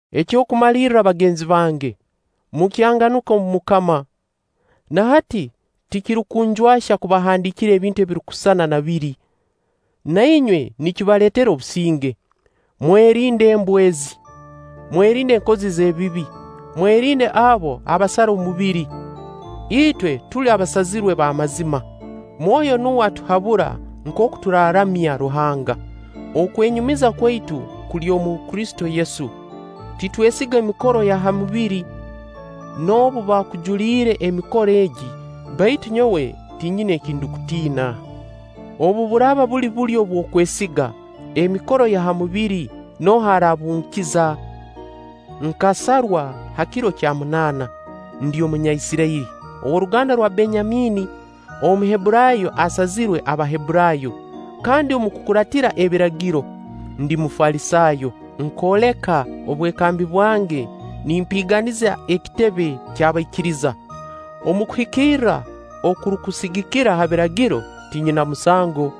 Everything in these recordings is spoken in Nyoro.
Eky'okumalirra bagenzi bange, mukyanganuke omu MUKAMA. Na hati tikirukunjwahya kubahandiikira ebintu ebirukusisana na biri. Na inywe nikibaleetera obusinge. Mwerinde embwa ezi! Mwerinde enkozi z'ebibi! Mwerinde abo abasara omubiri! Itwe tuli abasazirwe b'amazima, Mwoyo nuwe atuhabura nkooku turaaramya Ruhanga. Okwenyumiza kwaitu kuli omu Kristo Yesu. Titwesiga emikoro ya ha mubiri. Noobu baakujuliire emikoro egi, baitu nyowe tinyina eki ndukutiina. Obu buraaba buli bulyo obw'okwesiga emikoro ya ha mubiri, nooha araabunkiza? Nkasarwa ha kiro kya munaana, ndi Omunyaisirairi, ow'oruganda rwa Benyamiini, Omuhebburaayo ayazairwe Abahebburaayo, kandi omu kukuraatira Ebiragiro, ndi Mufalisaayo. Nkooleka obwekambi bwange nimpiiganiza ekitebe ky'abaikiriza. Omu kuhikirra okurukusigikira ha Biragiro, tinyina musango.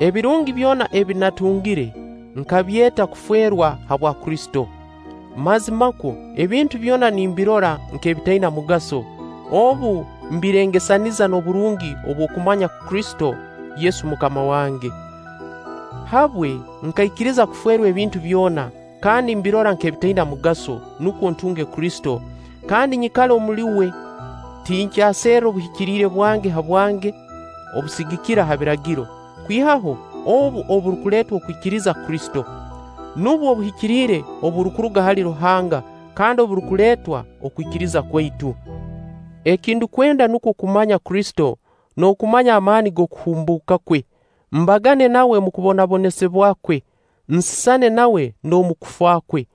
Ebirungi byona ebi natungire, nkabyeta kuferwa habwa Kristo. Mazimakwo, ebintu byona nimbirora nk'ebitaina mugaso obu mbirengesaniza n'oburungi obw'okumanya Kristo Yesu MUKAMA wange. Habwe nkaikiriza kuferwa ebintu byona kandi mbirora nk'ebitaina mugaso, nukwo ntunge Kristo, kandi nyikale omuli uwe. Tinkyaserra obuhikiriire bwange habwange obusigikira ha Biragiro, kwihaho obu oburukuleetwa okwikiriza Kristo. Nubwo obuhikiriire oburukuruga hali Ruhanga kandi oburukuleetwa okwikiriza kwaitu. Eki ndukwenda nukwo kumanya Kristo n'okumanya amaani g'okuhumbuuka kwe, mbagane nawe omu kubonabonesibwa kwe, nsisane nawe n'omu kufa kwe.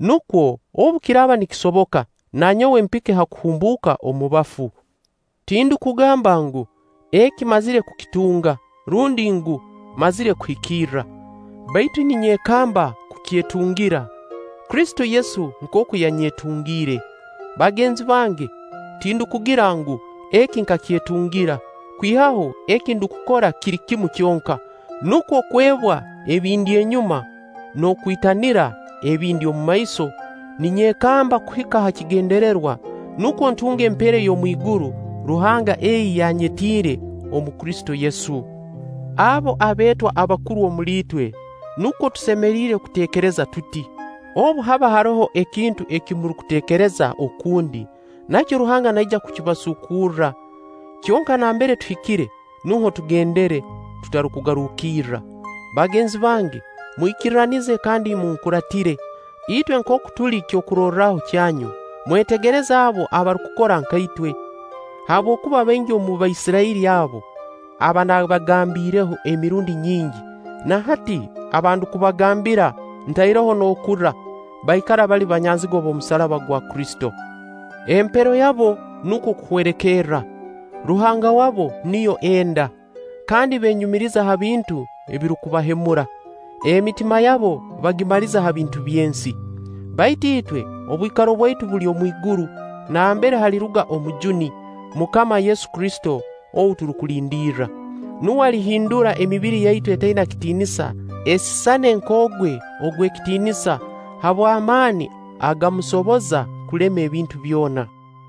Nukwo obu kiraaba nikisoboka, na nyowe mpike ha kuhumbuuka omu bafu. Tindukugamba ngu, eki mmazire kukitunga; rundi ngu, mmazire kuhikirra; baitu ninyekamba kukyetungira, Kristo Yesu nkooku yanyetungire. Bagenzi bange, tindukugira ngu, eki nkakyetungira; kwihaho eki ndukukora kiri kimu kyonka: nukwo kwebwa ebindi enyuma n'okwitanira ebindi omumaiso, ninyekamba kuhika ha kigendererwa, nukwo ntunge empeera ey'omwiguru Ruhanga ei yanyetiire omu Kristo Yesu. Abo abeetwa abakuru omuli itwe, nukwo tusemeriire kuteekereza tuti. Obu haba haroho ekintu eki murukuteekereza okundi, nakyo Ruhanga naija kukibasuukurra. Kyonka nambere tuhikire, muho tugendere tutarukugarukirra. Bagenzi bange mwikirranize kandi munkuraatire. Itwe nkooku tuli kyokurorraho kyanyu, mwetegereze abo abarukukora nka itwe. Habwokuba baingi omu Baisirairi abo, aba nabagambiireho emirundi nyingi, na hati aba ndukubagambira ntaireho n'okurra, baikara bali banyanzigwa b'omusaraba gwa Kristo. Empero yabo nukwo okuhwerekerra; ruhanga waabo niyo enda, kandi beenyumiriza ha bintu ebirukubahemura, emitima yabo bagimaliza ha bintu by'ensi. Baitu itwe, obwikaro bwaitu buli omwiguru, nambere haliruga Omujuni, MUKAMA Yesu Kristo ou turukulindirra. Nuwe alihindura emibiri yaitu etaina kitiinisa, esisane nk'ogwe ogw'ekitiinisa habw' amaani agamusoboza kulema ebintu byona.